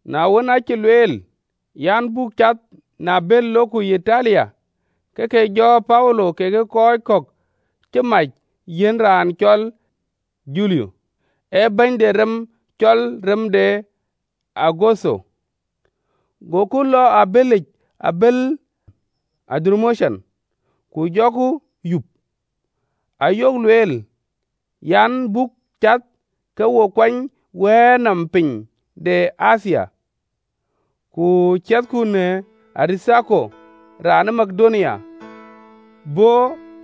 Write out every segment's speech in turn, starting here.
Na wën, aacï lueel an, buk cath në abël lok Yitalia, ke ke jɔ Paulo kekë kɔc kɔ̈k cï mac yiɛ̈n raan cɔl Julio, ee bɛ̈ny de rem cɔl rem de Augutho. Goku lɔ ë abëlic, abël ë Adramutium, ku jɔku yup, ayok lueel an, buk cath ke wo kuany wɛ̈ɛ̈r nɔm piny de Athia, ku ciɛthku në Aritharko, raan ë Makedonia bɔ̈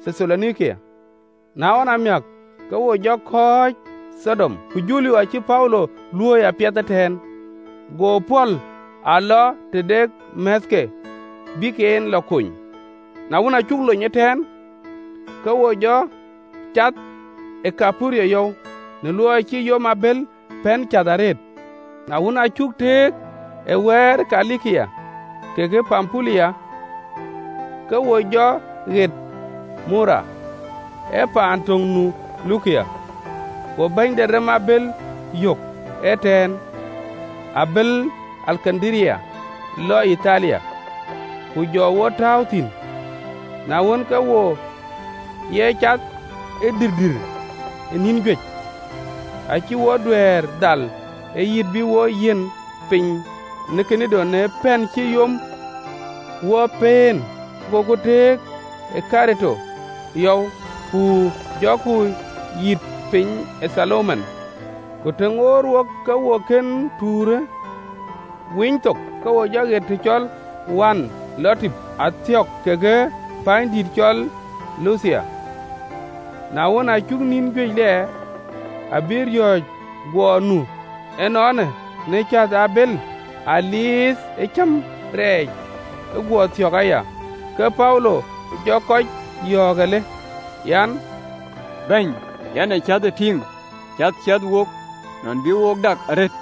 Thethalonike. Na ɣɔn amiäk, ke wo jɔ kɔ̈ɔ̈c ë Thidon. Ku Julio acï Paulo luöi apiɛth ëtɛ̈ɛ̈n, go pɔ̈l a lɔ tëde määthke, bïk en lɔ kony. Na wën, aa cuk lony ëtɛ̈ɛ̈n, ke wo jɔ cath ë Thaiperuth yɔu, në luɔi cï yom abël pɛ̈n cäth arëët. Na wën, aa cuk tëëk ë wɛ̈ɛ̈r ë Kilikia kekë Pampulia, ke wo jɔ ɣet Mura, ee paan töŋ nu Lukia. Go bɛ̈ny de rem abël yök ëtɛ̈ɛ̈n, abël ë Alekandaria lɔ Yitalia, ku jɔ wo tääu thïn. Na wën, ke wo ye cath ë dïïrdïïr ë nïn juëc, acï wo duɛ̈ɛ̈r dhal ë yiit bï wo yiit piny në Kinido, në pɛ̈n cï yom wo pëën, goku tëëk ë Kerete yɔu, ku jɔku yiit piny ë Thalmone. Ku të ŋoot wok ke wo kën tuurë winy thok, ke wo jɔ ɣet të cɔl Wanh Lɔdïp, athiɔ̈k kekë pänydït cɔl Lathia. Na wën, aa cuk nïn juëc lɛɛr, abï riɔ̈ɔ̈c guɔ nu ënɔɔnë në cäth ë abëlic, dhuëëŋ ee cäm rɛɛc ë guɔ thök aya, ke Paulo jɔ kɔc yɔ̈ɔ̈k alë, an: “Bäny, yɛn ë cäthë tïŋ, cäth ciɛth wok, nɔn bï wo dak arëët,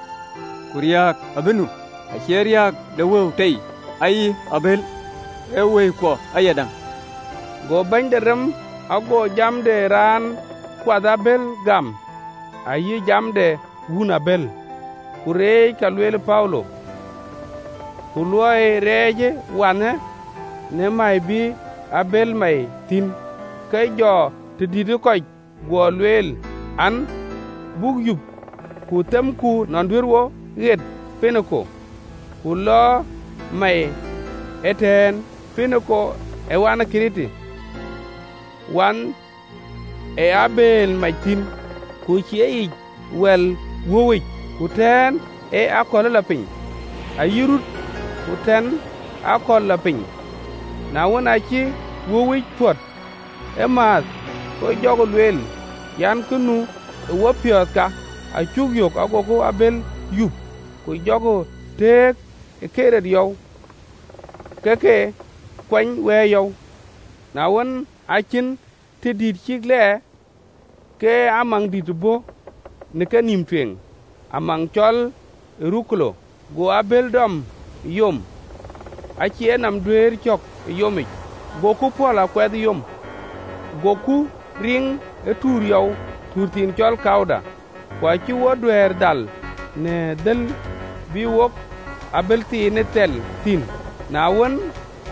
ku riääk abï nu, acie riääk de wëu tei ayï abël, ee wëikuɔ ayadäŋ.” Go bɛ̈ny de rem ago jam de raan kuath abël gam ayï jam de wun abël, ku reec ka lueel Paulo. Ku luɔi rɛɛcë wanhë në mäi bï abël mäi thïn, ku jɔ tëdït ë kɔc guɔ lueel an, buk yup ku themku nɔn duëër wo ɣet Poiniki, buk lɔ mäi ëtɛ̈ɛ̈n, Poiniki ee wanh ë Kerete, wanh ee abëël mac thïn, ku cï e yic wɛl wöuwic ku aköl athɛ̈i, ku të lɔ rut ku aköl athɛ̈i. Na wën, aacï wöuwic pɔ̈t ëmääth, ke jɔkï lueel an, kë nu ë wopiɔ̈ɔ̈th ka, acuk yök, gokï abël yup, ku jɔkï tëëk ë Kerete yɔu, ke ke kuany wɛ̈ɛ̈r yɔu. Na wën, aa cïn tëdïït cïk lɛɛr, ke amaŋdït bɔ̈ në kenïïm tueŋ, amaŋ cɔl Eurakulo. Go abël dɔm ë yom, acï e nɔm duɛ̈ɛ̈r cɔ̈k ë yomic, goku pɔ̈l, a kuɛɛth yom. Goku riŋ ë tuur yɔu, tuur thiin cɔl Kauda, ku acï wo duɛ̈ɛ̈r dhal në thël bï wok abël thiinë thɛl thïn. Na wën,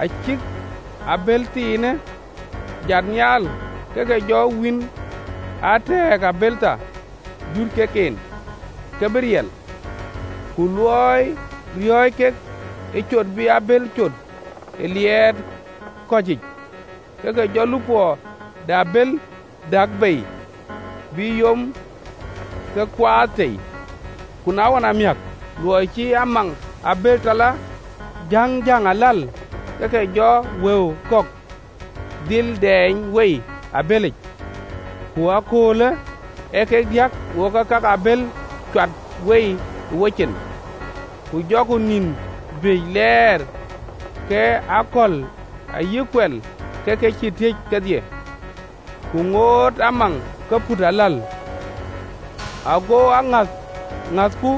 aa cïk abël thiinë jat nhial, ke ke jɔ wïïn a tɛ̈ɛ̈k abël thar, duut kek en, ke bï riɛl, ku luɔi riɔ̈ɔ̈c kek ë cot bï abël cot ë liɛɛt kɔ̈cic, ke ke jɔ lupɔ de abël däk bei, bï yom ke kuaath tei. Ku na ɣɔn amiäk, luɔi cï amaŋ abël tɔ lɔ jäŋjäŋ aläl, ke ke jɔ wëu kɔ̈k dhil dɛɛny wei ë abëlic, ku ëkööl ee kek diäk wok cï ka ke abël cuat wei ë wocin. Ku jɔku nin juëc lɛɛr ke akɔ̈l ayï kuɛl ke ke cïï tiëc kedhie, ku ŋoot amaŋ ke put aläl, ago aŋäth ë ŋäthku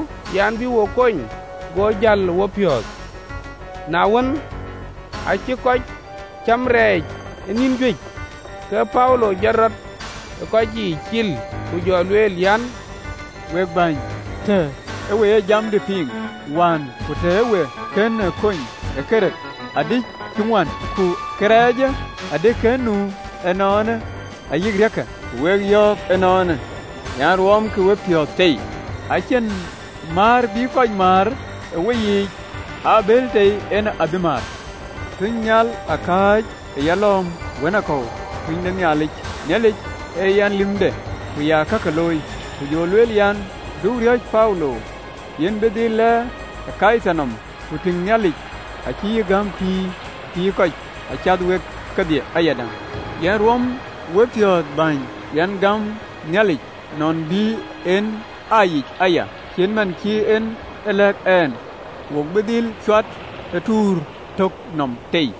an, bï wo kony, go jäl ë wopiɔ̈ɔ̈th. Na wën, aacï kɔc cäm rɛɛc ë nïn juëc, ke Paulo jɔt rɔt ë kɔc yiic cil, ku jɔ lueel an, “Week bäny, tëë we ë jamdï piŋ wään ku tëë wo kën lony Kerete, adï cï ŋuän, ku kërɛɛcë adï kën nu ënɔɔnë ayï ë riääkkë. Ku wek yɔ̈ɔ̈k ënɔɔnë an, ruɔmkï wepiɔ̈ɔ̈th tei! Acïn määr bï kɔc määr ë weyiic, ee abël tei en abï määr. Tunynhial aa kääc ë yalɔ̈ɔ̈m wënakɔ̈u, tuny de Nhialic, Nhialic a yɛn lïmde ku ee yen ya lam, ku jɔ lueel an, ‘Du riɔ̈c, Paulo, yïn bï dhil lɛɛr ë Kaithar nɔm. Ku tïŋ, Nhialic acï yï gäm pïïr pïïrë kɔc cath wek kedhie ayadäŋ.’ Yen ruɔm wek wepiɔ̈ɔ̈th, bäny! Yɛn gam Nhialic, nɔn bï en aa yic aya, cït man cï en e lɛ̈k ɛn. Wo bï dhil cuat ë tuur tök nɔm tei.”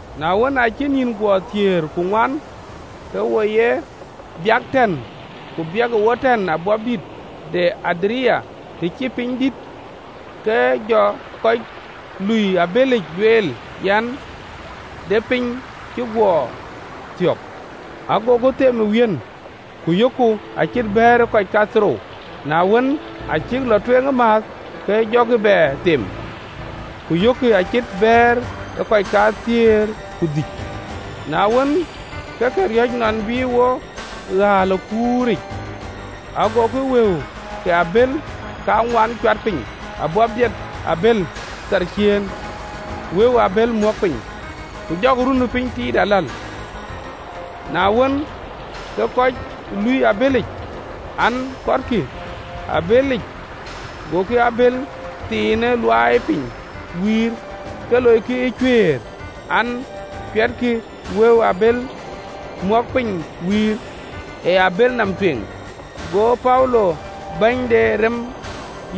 Na wën, aacï nïn guɔ thiëër ku ŋuan, ke wo ye biäk tɛ̈ɛ̈n ku biɛ̈ɛ̈kë wo tɛ̈ɛ̈n në abäpdit yic, të cï piny dït, ke jɔ kɔc lui abëlic lueel an, de piny cï guɔ thiɔ̈k. Agokï them ë wiën, ku yökkï acït bɛ̈ɛ̈r ë kɔc kathiërrou, na wën, aa cïk lɔ tueŋ ëmääth, ke jɔkï bɛ them, ku yökkï acït bɛ̈ɛ̈r ë kɔc kathiëër ku dhïc. Na wën, ke ke riɔ̈c nɔn bï wo ɣääl ë kur yiic, agokï wëu ke abël kaŋuan cuat piny ë wɛ̈ɛ̈ric në abël thar ciëën, wëu ë abël mɔ̈k piny, ku jɔkï runëpiny tiit aläl. Na wën, ke kɔc lui abëlic an, kɔtkï abëlic, gokï abël thiinë luaai piny wïïr, ke loikï ë cuëër an, cuɛtkï wëu ë abël mɔ̈k piny wïïr, ë abël nɔm tueŋ. Go Paulo bɛ̈ny de rem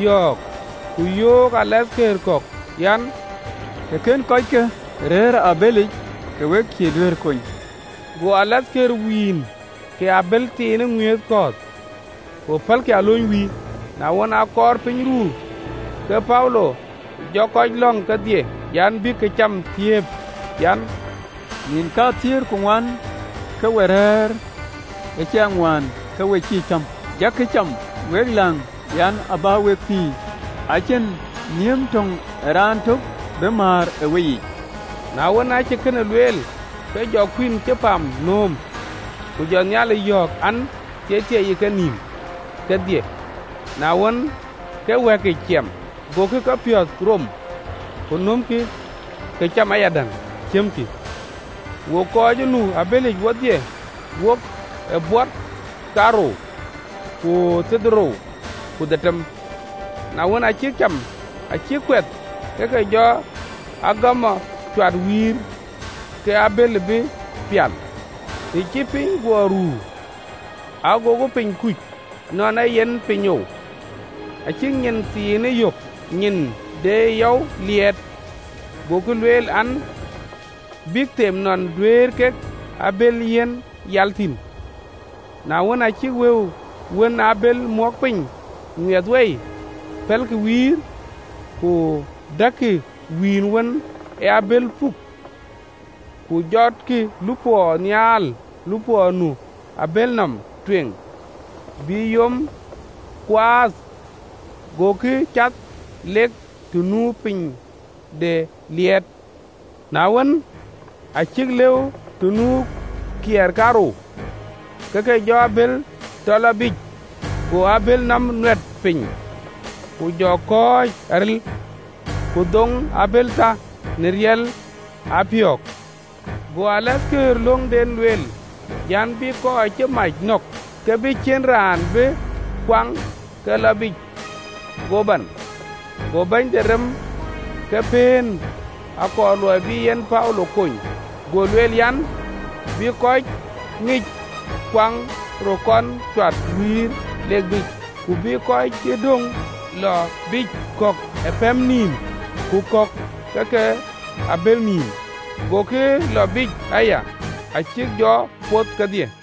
yɔ̈ɔ̈k, ku yöök rem de tɔŋ kɔ̈k an, “Të kënë kɔckë rëër ë abëlic, ke we cïï duëërë kony.” Go rem de tɔŋ wïïn ke abël thiinë ŋuith kɔ̈ɔ̈th, ku pälkï alööny wïïr. Na wën, aa kɔɔr piny ruu, ke Paulo jɔ kɔc lɔ̈ŋ kedhie an, bïk këcam thiëëp an, “Nïn kathiëër ku ŋuan ke we rɛ̈ɛ̈r ëcaŋwään, ke we cïï cäm. Jakï cam, wek läŋ, yen abä wek pïïr. Acïn nhiëm töŋ ë raan tök bï määr ë weyiic.” Na wën, aacï kënë lueel, ke jɔ kuïn cï pam nööm, ku jɔ Nhialic yɔ̈ɔ̈k, an, Thieithieei, ë kenïïm kedhie, na wën, ke wɛ̈kic ciɛm. Gokï kepiɔ̈ɔ̈th rom, ku nömkï këcam ayadäŋ, ciɛmkï. Wok kɔc ë nu abëlic wodhie, wok ee bot kaarou ku thiërdhorou ku dhetem. Na wën, aa cïk cam acïk kuɛth, ke ke jɔ agamɔ cuat wïïr, ke abël bï pial. Të cï piny guɔ ruu, agokï piny kuc, nɔn ee yen pinyou, acïk nyin thiinë yök, nyin de yɔu liɛɛt, gokï lueel an, bïk them nɔn duëër kek abël yiɛ̈n yal thïn. Na wën, aa cïk wëu wën ë abël mɔ̈k piny ŋuiɛth wei, pɛ̈lkï wïïr, ku däkkï wïïn wën ee abël puk, ku jɔtkï lupɔ nhial lupɔ nu ë abël nɔm tueŋ, bï yom kuaath, goku cath lok të nu piny de liɛɛt. Na wën, aa cïk lëu të nu kiɛɛr kaarou, ke ke jɔ abël tɔ lɔ biic, go abël nɔm nuɛt piny ku jɔ kɔ̈ɔ̈c aril, ku dhoŋ abël thar në riɛl ë apiöök. Go rem de tɔŋ löŋden lueel an, bï kɔc cï mac nɔ̈k, ke bï ciën raan bï kuaŋ ke lɔ biic, go ban. Go bɛ̈ny de rem ke pëën, akɔɔr luɔi bï en Paulo kony, go lueel an, bï kɔc ŋic kuaŋ röt kɔn cuat wïïr, lek biic, ku bï kɔc cï döŋ lɔ biic, kɔ̈k ë pɛɛm nïïm, ku kɔ̈k ë ka ke abël nïïm. Gokï lɔ biic aya, acïk jɔ poth kedhie.